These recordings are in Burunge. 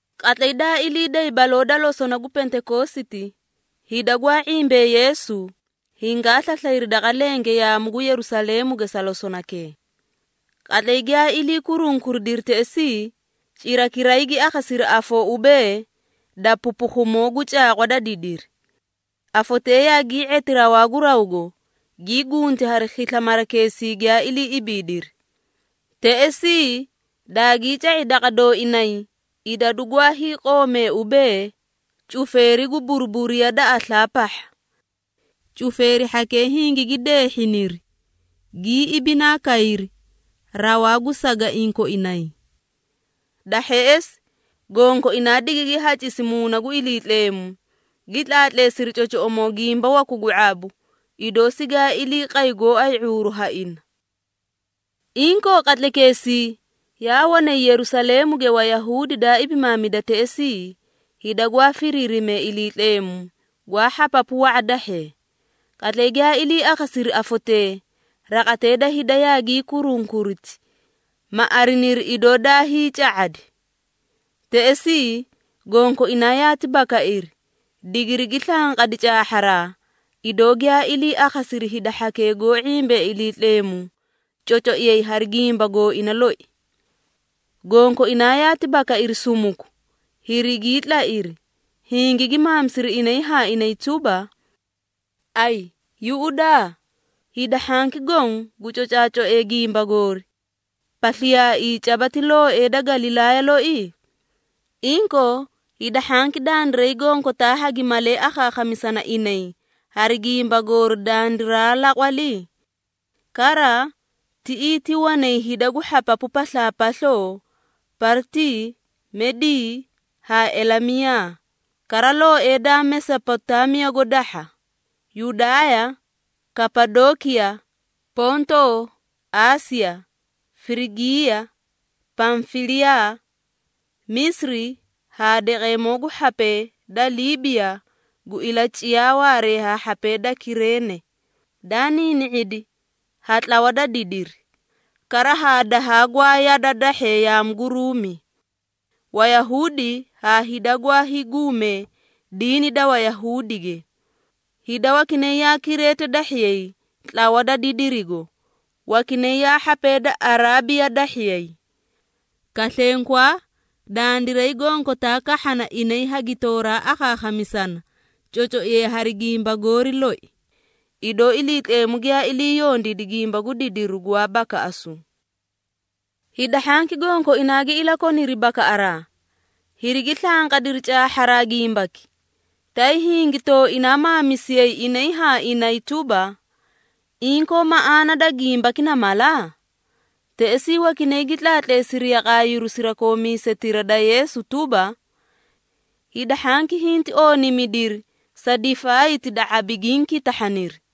Qatlay daa ilii day baloo da losona gu Pentekoositi hida gwaa ⁄imbee Yeesu, hingaa slaslayri daqa lenge yaamu gu Yerusaleemuge sa losonakee. Qatlay giyaa ilii kurunkuridiri teꞌesii, cirakiray gi akhasiri afoo ubee, da pupukhumoo gu caaqwa da didiri. Afotee yaagii⁄eti rawaa gu rawgo, gii gunti hari khisla marakeesii giyaa ilii ibiidiri. Teꞌesii, daagii ca⁄i daqa dooinay idadu gwaa hiiqoomee ubee, cufeeri gu buruburiya da aslaa pahha. Cufeeri hhakee hingigi deehhiniri, gii ibinaa kayri rawaa gu sagaiĩ koinay. Da hheꞌesi, gonkoinaa digigi hacisi Muuna gu Iliitleemu, gi tlaatleesiri cocoꞌomoo gimba waku gu ⁄abu, idoo sigaa ilii qay gooay ⁄uuru ha ina. Inkoo qatlaykeesii, yaa wanay Yerusaleemuge Wayahuudi daa ibimaamida teꞌesii, hida gwaa firiirimee Iliitleemu, gwaa hhapapu wa⁄a dahhee. Qatlay giyaa ilii akhasiri afotee, raqatee da hida yaagii kurunkuriti, ma ariniri idoo daa hiica⁄adi. Teꞌesii gonkoinaa yaati bakairi, digirigi slanqadi caahharaa, idoo giyaa ilii akhasiri hida hhakee goó ⁄imbee Iliitleemu cocoiyay hari gimba gooina loi. Gonkoinaa yaati bakairi sumuku, hirigii tlairi, hingigi maamisiri inay haa inay tuba, “Ayi yuꞌudaa! Hida hhanki goõ gu cocaacoee gimba goori, pasliyaaii caba ti looee da Galilaaya loi? Inkoo, hida hhanki dandiray gonkotaa hagi malee akhaakhamisana inay hari gimba goori dandiraa laqwali? Kara, tiꞌii ti wanay hida gu hhapapu paslaapasloo, Partii, Medii haa Elamiyaa, kara looee daa Mesopotaamiyago dahha, Yudaaya, Kapadookiya, Pontoo, Aasiya, Firigiiya, Pamfiliyaa, Misiri haa daqeemoo gu hhapee da Liibiya gu ilaciyaa waaree haa hhapee da Kireene, daa niini⁄idi ha tlawa da didiri, kara haa dahaa gwaa yada dahhee yaamu gu Ruumi, (Wayahuudi haa hida gwaa hiiguumee diini da Wayahuudige). Hida wakinay yaa Kireete dahhiyay tlawa da didirigo, wakinay yaa hhapee da Araabiya dahhiyay. Kaslenkwaa, dandiray gonkotaa kahhana inay hagitooraa akhaakhamisana cocoiyay hari gimba goori loi, idoo Iliitleemu giyaa ilii yondiidi gimba gu didiru gwaa bakaꞌasu!” Hida hhanki gonkoinaa gi ilakoniri bakaꞌaraa, hirigi slanqadiri caahharaa gimbaki, tay hingi tooinaa maamisiyay inay haa inay tuba, “Inkoo maꞌaana da gimbaki na mala?” Teꞌesii wakinay gi tlaatleesiri yaqaayiru sirakoomisetira da Yeesu tuba, “Hida hhanki hinti ooniimidiri sa difaayti da ⁄abi giĩ kitahhaniri!”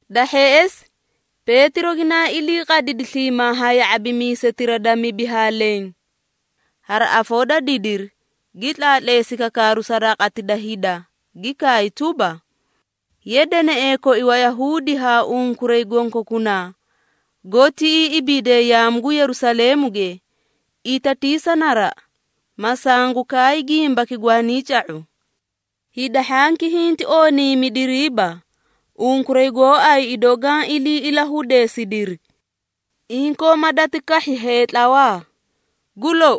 Da hheꞌesi Peetiro ginaa ilii qadidi sliimaa haa ya⁄abimiisetira daa mibi haa leẽ. Hari afoo da didiri gi tlaatleesi kakaaru sa raqati da hida gi kaay tuba, “Ye deneꞌee koi Wayahuudi haa unkuray gonkokunaa goó tiꞌii ibiidee yaamu gu Yerusaleemuge, itatiisa naraꞌa, ma sangu kaay gimbaki gwaanii ca⁄u.” Hida hhanki hinti ooniimidiriiba, unkuray gooay idoo gaã ilii ilahudeesidiri! Inkoo ma dati kahhi heetlawaa. Gu lou,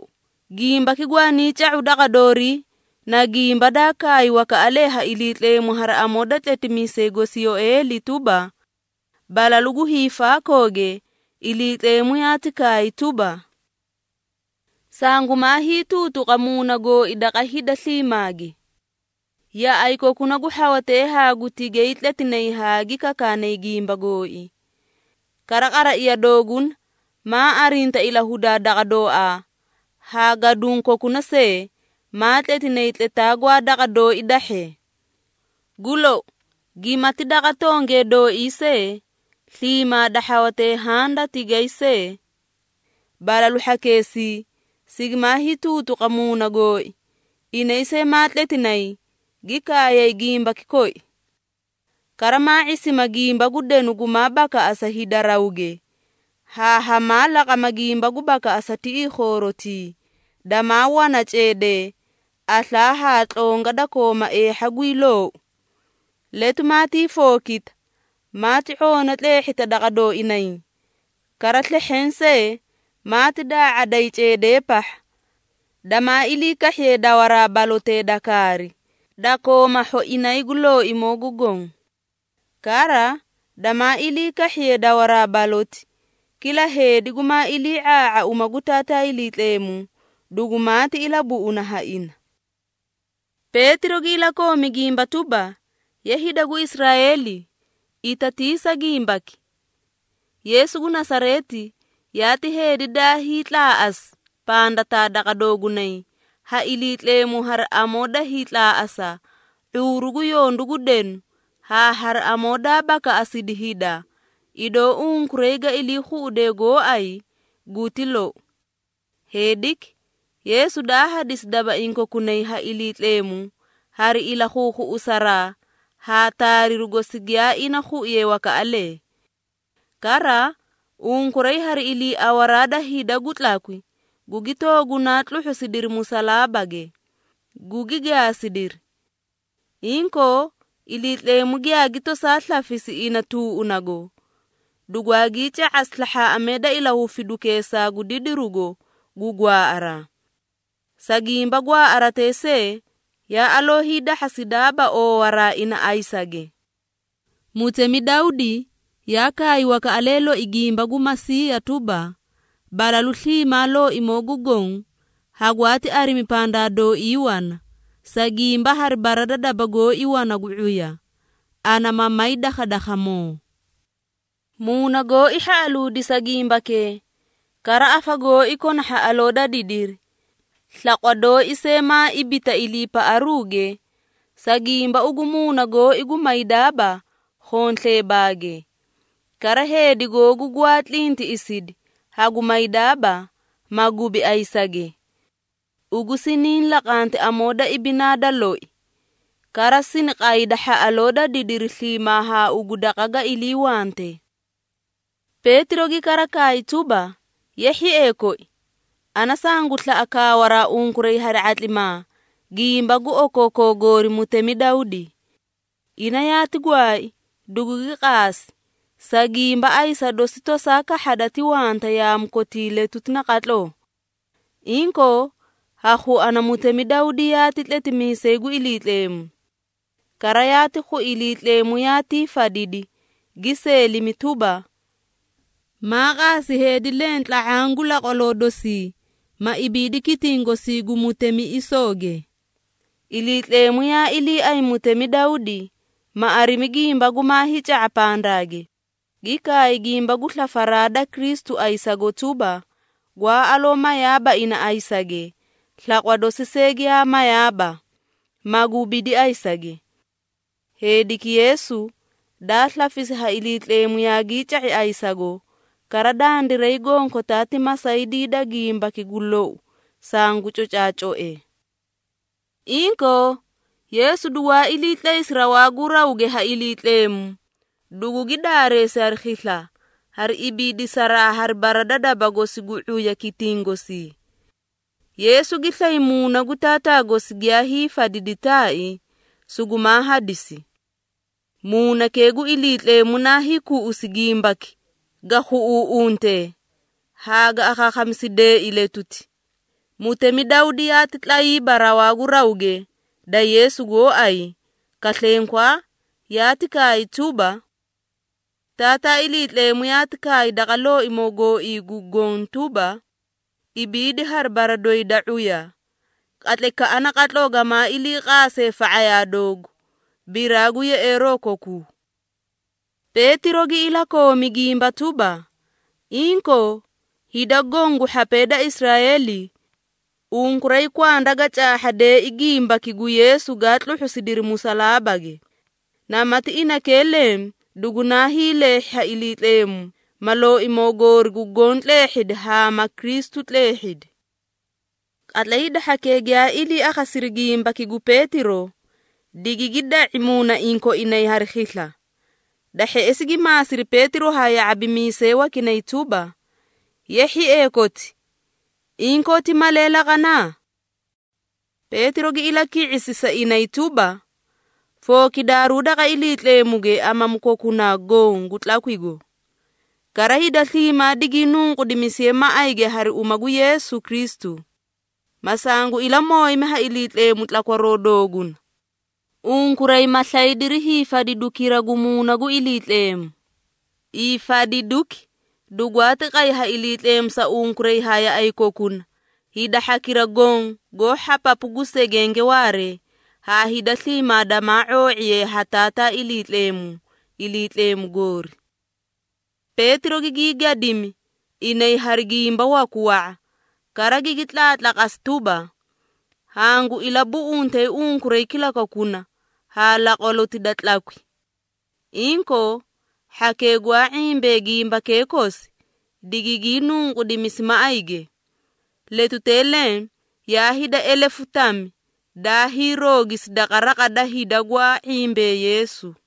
gimbaki gwaanii ca⁄u daqa doorii, na gimba daa kaay wakaꞌalee ha Iliitleemu hari amoo da tletimiisay gosi Yoeeli tuba, “Balalu gu hiifaakooge, Iliitleemu yaati kaay tuba, ‘Sangumaa hiituutuqa Muuna gooi daqa hida sliimaage. Yaꞌay kokuna gu hhawatee haa gu tigay tletinay haa gi kakaanay gimba gooi, kara qaraiya dooguna maa arinta ilahudaa daqa dooaa, haa gaduũ kokuna see, maa tletinay tletaa gwaa daqa dooi dahhee. Gu lou, gimati daqa tongee dooi see, sliimaa da hhawatee haã da tigay see, balalu hhakeesii, sigimaa hiituutuqa Muuna gooi, inay see maa tletinay, gi kaayay gimbaki koi. Kara maa ⁄isima gimba gu denu gumaa bakaꞌasa hida rawge, haa hamaa laqama gimba gu bakaꞌasa tiꞌii khoorotii, damaa wana ceedee, aslaa haa tlonga da kooma eehha guyii loou. Letu maatii fookita, maati ⁄oona tleehhita daqa dooinay, kara slehheẽ see, maati daa⁄aday ceedee pahha, damaa ilii kahhiye dawaraa balotee da kaari, da kooma hhoinay gu Looimoo gu Goõ. Kara, damaa ilii kahhiye dawaraa baloti, kila heedi gumaa ilii⁄aa⁄aa uma gu Taataa Iliitleemu, dugumaati ilabuꞌuna ha ina.’” Peetiro gi ilakoomi gimba tuba, “Ye hida gu Israeeli, itatiisa gimbaki! Yeesu gu Nasareeti yaati heedi daa hiitlaaꞌasi pandataa daqa doogunay ha Iliitleemu hari amoo da hiitlaaꞌasa ⁄uuru gu yondu gu denu haa hari amoo daa bakaꞌasidi hida, idoo unkuray ga ilii khuꞌudee gooay, guti lou. Heediki, Yeesu daa hadisi dabaiĩ kokunay ha Iliitleemu hari ilakhuukhuꞌusaraa haa taariru gosi giyaa ina khuiye wakaꞌalee. Kara unkuray hari iliiawaraa da hida gu tlakwi, gugi toogunaa tluhhusidiri musalaabage, gugi gaasidiri. Inkoo, Iliitleemu giyaagi tosaa slafisi ina tuuꞌunago, dugwaagii ca⁄asi slahhaaꞌamee da ilahufidukeesaa gu didirugo gu gwaaꞌaraa. Sa gimba gwaaꞌaratee see yaa aloo hiidahhasidaaba oowaraa ina ayisage. Mutemi Dawdi yaa kaay wakaꞌalee loi gimba gu Masiiya tuba, ‘Balalu sliimaa Looimoo gu Goõ hagwaati arimi pandaa dooii wana, sa gimba hari bara da daba gooi wana gu ⁄uya, ana ma may dakhadakhamoo. Muuna gooi hhaꞌaluudi sa gimbakee, kara afa gooi kona hhaꞌaloo da didiri, slaqwa dooi see maa ibita iliipaꞌaruuge, sa gimba ugu muuna gooi gu maydaaba khonsleebaage, kara Heedi Googu Gwaa tlintiꞌisidi, hagu maydaaba, ma gubi ayisage. Ugu siniĩ laqanti amoo da ibinaa da loi, kara sini qayda hhaꞌaloo da didiri sliimaa haa ugu daqa ga iliiwante.’” Peetiro gi kara kaay tuba, “Ye hhiee koi, ana sangu slaꞌa kaawaraa unkuray hari ⁄atlimaa gimba gu okookoo goori mutemi Dawdi. Ina yaati gwaai, dugugi qaasi, sa gimba ayisa dosi tosaa kahhada ti wanta yaamu kotii letuti naqatloo. Inkoo, ha khuana mutemi Dawdi yaati tletimiisay gu Iliitleemu. Kara yaati khui Iliitleemu yaatii fadidi, gi seelimi tuba, ‘Maa qaasi heedi leẽ tla⁄aã gu laqwaloo dosii, ma ibiidi kitiĩ gosii gu mutemiꞌisooge.’” Iliitleemu yaa iliiay mutemi Dawdi, ma arimi gimba gumaa hiica⁄a pandaage, gi kaay gimba gu slafaraa da Kristu ayisago tuba, gwaa aloo mayaaba ina ayisage, slaqwa dosi see giyaa mayaaba, ma gubidi ayisage. Heediki Yeesu, daa slafisi ha Iliitleemu yaagii ca⁄i ayisago, kara dandiray gonkotaa ti masaydii da gimbaki gu lou sangu cocaacoe. Inkoo, Yeesu dugwaa ilii tlaysi rawaa gu rawge ha Iliitleemu, dugugi daareesi hari khisla, hari ibiidisaraa hari bara da daba gosi gu ⁄uya kitiĩ gosii. Yeesu gi slay Muuna gu Taataa gosi giyaa hiifadidi taai, sugumaa hadisi. Muunakee gu Iliitleemu naa hiikuꞌusi gimbaki ga khuꞌuuꞌuntee, haa ga akhaakhamisideei letuti. Mutemi Dawdi yaati tlayiiba rawaa gu rawge da Yeesu gooay, kaslenkwaa, yaati kaay tuba, “Taataa Iliitleemu yaati kaay daqa Looimoo gooii gu Goõ tuba, ‘Ibiidi hari bara doyi da ⁄uya, qatlaykaꞌa naqatloo gamaa ilii qaase fa⁄ayaa doogu, biraa gu yeꞌeeroo kokuu.’” Peetiro gi ilakoomi gimba tuba, “Inkoo, hida goõ gu hhapee da Israeeli, unkuray kwanda ga caahhadeei gimbaki gu Yeesu gaa tluhhusidiri musalaabage. Namati inakee leẽ dugunaa hiileehhi ha Iliitleemu, ma Looimoo goori gu Goõ tleehhidi haa ma Kristu tleehhidi.” Qatlay hida hhakee giyaa ilii akhasiri gimbaki gu Peetiro, digigi da⁄i muunaiĩ koinay hari khisla. Da hheꞌesi gi maasiri Peetiro haa ya⁄abimiisee wakinay tuba, “Ye hhiee koti, inkoo ti malee laqana?” Peetiro gi ilaki⁄isi sa inay tuba, “Fookidaaruu daqa Iliitleemuge amamu kokunaa goõ gu tlakwigo. Kara hida sliimaa digii nunqudimisiye maꞌayge hari uma gu Yeesu Kristu, ma sangu ilamooyimi ha Iliitleemu tlakwaroo dooguna. Unkuray ma slaydiri hiifadidukira gu Muuna gu Iliitleemu. Hiifadiduki dugwaati qay ha Iliitleemu sa unkuray haa yaꞌay kokuna, hida hhakira goõ goó hhapapu gu segenge waaree, haa hida sliimaa damaa ⁄oo⁄iye ha Taataa Iliitleemu, Iliitleemu goori.” Peetiro gigii gadimi inay hari gimba waku wa⁄a, kara gigi tlaatlaqasi tuba, “Hangu ilabuꞌuntee unkuray kilakokuna haa laqwaloti da tlakwi.” Inkoo, hhakee gwaa ⁄imbee gimbakee kosi, digigii nunqudimisi maꞌayge. Letutee leẽ yaa hida elefu tami daa hiirogisi daqa raqa da hida gwaa ⁄imbee Yeesu.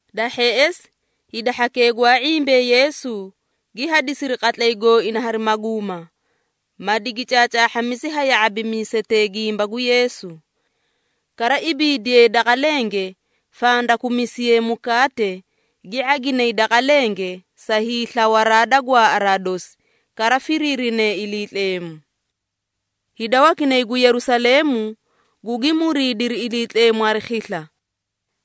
Da hheꞌesi hida hhakee gwaa ⁄imbee Yeesu, gi hadisiri qatlay gooina hari maguuma, ma digi caacaahhamisi ha ya⁄abimiisetee gimba gu Yeesu. Kara ibiidiye daqa lenge, fandakumisiye mukaate, gi ⁄aginay daqa lenge sa hiislawaraa da gwaaꞌaraa dosi, kara firiirinee Iliitleemu. Hida wakinay gu Yerusaleemu gugi muriidiri Iliitleemu hari khisla.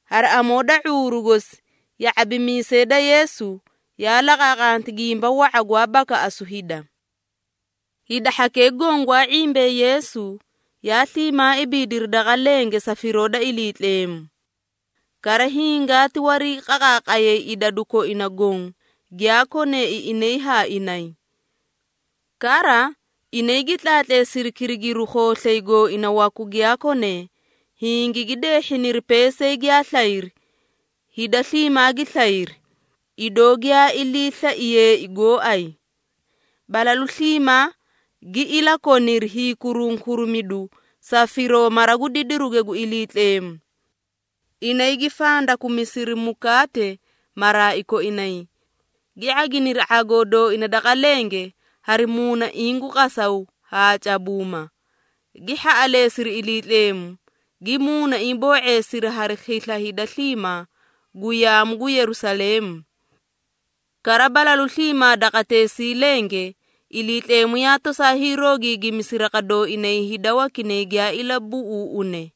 Hari amoo da ⁄uuru gosi ya⁄abimiisee da Yeesu yaa laqaaqanti gimba wa⁄a gwaa bakaꞌasu hida. Hida hhakee goõ gwaa ⁄imbee Yeesu, yaa sliimaa ibiidiri daqa lenge sa firoo da Iliitleemu. Kara hingaati wariiqaqaaqayay idadu koina goõ giyaa koneei inay haa inay. Kara, inay gi tlaatleesiri kirigiruu khooslay gooina waku giyaa konee, hingigi deehhiniri peesay giyaa slayri, hida sliimaa gi slayri, idoo giyaa ilii slaiyeei gooay. Balalu sliimaa gi ilakoniri hiikurunkurimidu sa firoo mara gu didiruge gu Iliitleemu. Inay gi fandakumisiri mukaate maraai koinay, gi ⁄aginiri ⁄agoo dooina daqa lenge hari muunaiĩ gu qasaw haa cabuuma, gi hhaꞌaleesiri Iliitleemu, gi muunaiĩ boo⁄eesiri hari khisla hida sliimaa gu yaamu gu Yerusaleemu. Kara balalu sliimaa daqateesii lenge Iliitleemu yaa tosaa hiiroogiigimisi raqa dooinay hida wakinay giyaa ilabuꞌuuꞌune.